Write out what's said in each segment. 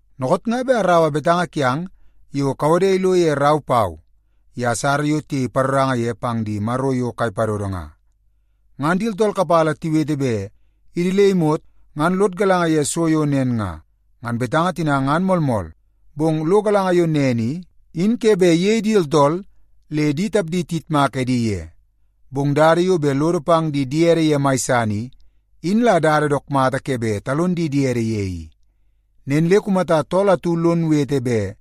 Dookoot nga bet araua betanga kiang yo kawode ilo ye rau pau ye asara yo tiyei paroranga ye pang di maro yo kai padodo nga. Ngan di tooltool kapala tiwete bet idi le imot ngan lod galanga ye so yo nen nga, ngan betanga tina ngan moolmool. Bong lo galanga yo nen i, in ke bet iyei di tooltool le di tapdi tiyitmak edi ye. Bong dada yo bet lodo pang di diede ye mai san i, in la dada dook mata ke bet talon di diede ye i. Nen le kumata tool atu lon wete bet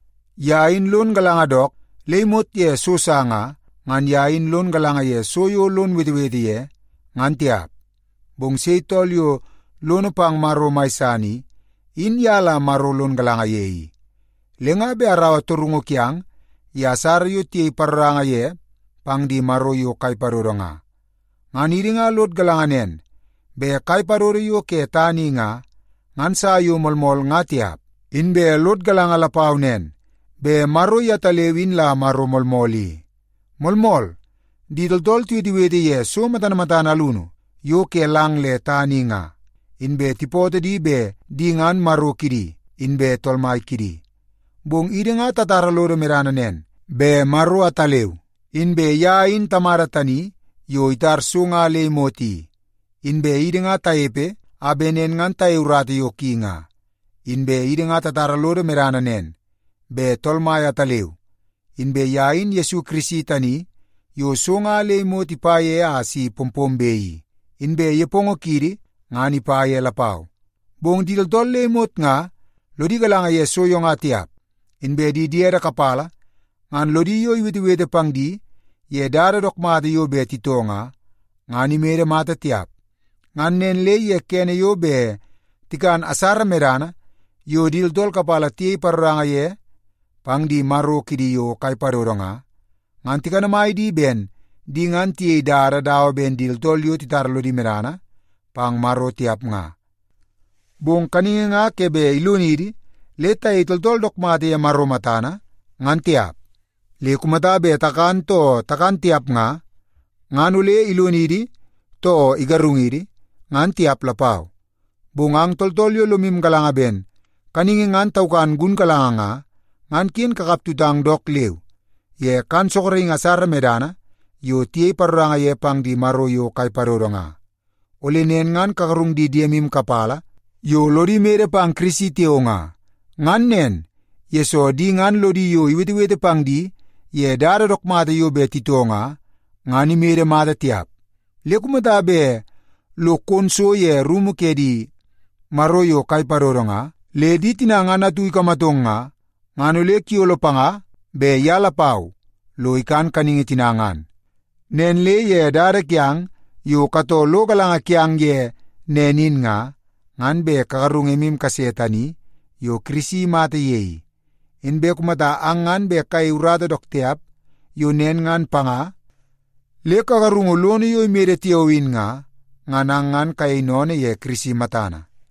ye in lon galanga dook le imot ye so sa nga, ngan ye in lon galanga ye so yo lon wetewete ye, ngan tiap. Bong sei tool yo lono pang Maro mai san i, in ye la Maro lon galanga ye i. Le nga bet araua torungu kiang tani ye asara yo tiyei paroranga ye pang di maro yo kai padodo nga. Ngan idi nga lod galanga nen bet kai padodo yo ke tana i nga, ngan sa yo moolmool ngan tiap. Inbe lod galanga lapau nen bet Maro yetaleu in la Maro moolmool i. Moolmool, di tooltool tiwetewete ye so matana matana alunu yo ke lang le tana i nga, inbe tipootoo di bet di ngan “maro” kidi inbe “tool mai” kidi. Bong idi nga tatara lodo medana nen, bet Maro ataleu, inbe ye in Tamada tani yo itar so nga le imot i. Inbe idi nga tanepe a bet nen ngan tayei urata yo ki nga. Inbe idi nga tatara lodo medana nen, bet Tool Mai ataleu, inbe ye in Yesu Kirisi tani yo so nga le imot ipa ye a si pompombe i. Inbe nepongo kiidi ngan ipa ye lapau. Bong di tooltool le imot nga lodi galanga ye so yo nga tiap. Inbe di diede kapala ngan lodi yo iwetewete pang di ye dada dook mata yo bet titoo nga, ngan imede mata tiap. Ngan nen le ye kene yo bet tikan asara medana yo di tooltool kapala tiyei paroranga ye pang di maro kidi yo kai padodo nga, ngan tikanamai di ben di ngan tiyei dada dawa ben di tooltool yo titara lodi medana pang Maro tiap nga. Bong kaningi nga ke bet ilonidi le tayei tooltool dook mata ye Maro matana ngan tiap. Le kumata bet takan too takan tiap nga, ngan ole ilonidi too igarungidi, ngan tiap lapau. Bong ang tooltool yo lomu galanga ben kaningi ngan taukan gunkalanga nga, ngan ken kakap tutang dook leu ye kan sorokingi asara medana yo tiyei paroranga ye pang di maro yo kai padodo nga. Ole nen ngan kagarung di diemu kapala yo lodi mede pang Kirisi tiao nga. Ngan nen, yesoo di ngan lodi yo iwetewete pang di ye dada dook mata yo bet titoo nga, ngan imede mata tiap. Le kumata bet lo kon so ye rumu ke di maro yo kai padodo nga, le di tina ngan atu ikamatong nga, ngan ole kuyolo panga bet ye lapau lo ikan kaningi tina ngan. Nen le ye dada kiang yo katoo lo galanga kiang ye nen in nga, ngan bet kagarungu emu kase tani yo Kirisi imata ye i. Inbe kumata le ang ngan bet kayei urata dook tiap yo nen ngan panga le kagarungu lono yo imede tiao in nga, ngan ang ngan kayei sennene ye Kirisi matana.